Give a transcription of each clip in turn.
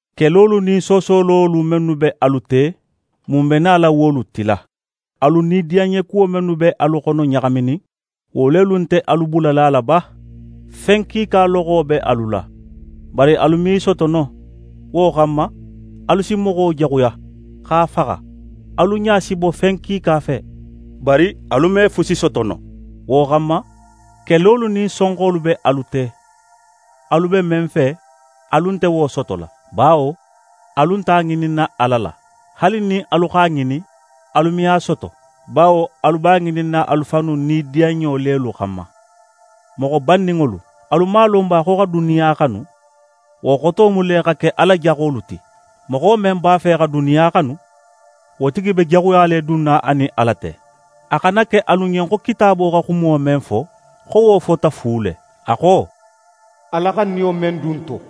Kelolu nin soosololu mennu be alu te, mun be nala wolu tila? Alu nidiyanɲekuwo mennu be alu xono ɲaxaminin, wo lelu nte alu bulala a la ba? Fen kiika loxo be alu la, bari alu me i soto no. Wo xanma, alu si moxo jaxuya, x'a faxa. Alu ɲa si bo fen kiika fe, bari alu me fusi soto no. Wo xanma, kelolu nin sonxolu be alu te. Alu be men fe, alu nte wo sotola; bawo alu nte a ŋininna Ala la. Haali nin alu x'a ŋinin, alu me a soto; bawo alu b'a ŋininna alu fannu nidiyanɲo lelu xanma. Moxo banninŋolu! Alu man a lon ba xo xa duniya xanu, wo xoto mu le xa ke Ala jaxolu ti? Moxo men b'a fe xa duniya xanu, wo tigi be jaxuya le dunna a nin Ala te. A xana ke alu ɲen xo Kitaabo xa xumo men fo, xo wo fota fu le. A xo: «Ala xa niyo men dun n to,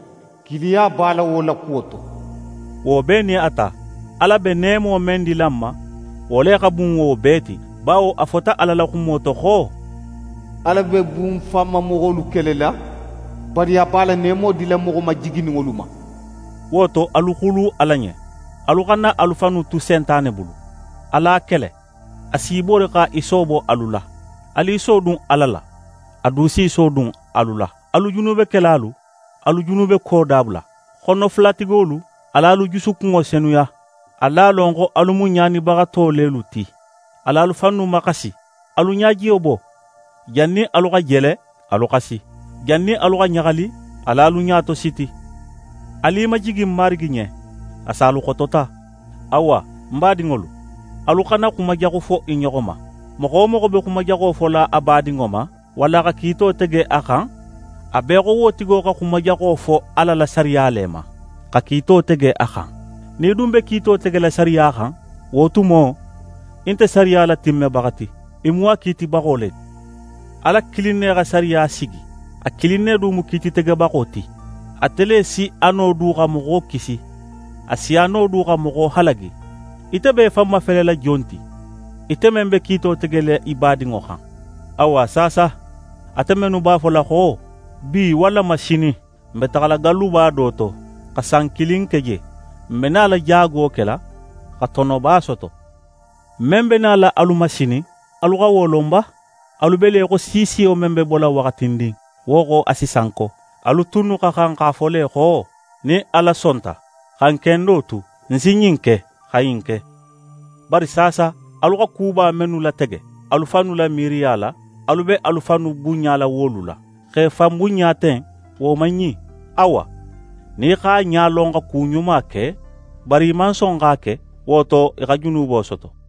kiiliya b'a la wo la kuwo to.» Wo bee nin a ta, Ala be neemo men dila n ma, wo le xa bun wo bee ti, bawo a fota Ala la xumo to xo: «Ala be bunfanmamoxolu kelela, bari a be a la neemo dila moxo majigininŋolu ma.» Wo to, alu xulu Ala ɲen. Alu xana alu fannu tu Sentane bulu, alu a kele, a s'í bori xa í soobo alu la. Alu i sodun Ala la, a du s'í sodun alu la. Alu junubekelalu, alu junubeko dabula. Xonofulatigolu, al'alu jusukunŋo senuya! Alu a lon xo alu mu ɲaanibaxato lelu ti. Al'alu fannu maxasi, alu ɲajiyo bo. Jannin alu xa jele, alu xasi. Jannin alu xa ɲaxali, al'alu ɲa tositi. Alu i majigi Marigi ɲen, a si alu xotota. Awa, ń badinŋolu, alu xana xuma jaxu fo i ɲoxo ma. Moxo wo moxo be xuma jaxo fola a badinŋo ma walla xa kiito tege a xan, a be í xo wo tigo xa xuma jaxo fo Ala la sariya le ma, xa kiito tege a xan. Nin í dun be kiito tegela sariya xan, wo tumo, í nte sariya latimmebaxa ti, í mu a kiitibaxo le ti. Ala kilin ne xa sariya sigi, a kilin ne du mu kiititegebaxo ti. Ate le si a no du xa moxo kisi, a si a no du xa moxo halagi. Ite be í fan mafelela jon ti, ite men be kiito tegela í badinŋo xan? Awa, saasa, ate mennu b'a fola xo: «Bi wallama sinin, n be taxala galluba do to xa san kilin ke je. N be nala jaago kela xa tonoba soto.» Men be nala alu ma sinin, alu xa wo lon ba? Alu be le í xo siisiyo men be bola waxatindin, wo xo, a si sanko. Alu tunnu xa xan x'a fo le xo: «Nin Ala sonta, xa n kendo tu, n si ɲin ke, xa ɲin ke.» Bari saasa, alu xa kuba mennu latege alu fannu la miiriya la, alu be alu fannu bunɲala wolu la. Xa í fan bunɲa ten, wo man ɲin. Awa, nin í x'a ɲa lon xa ku ɲuma ke, bari í man son x'a ke, wo to, í xa junubo soto.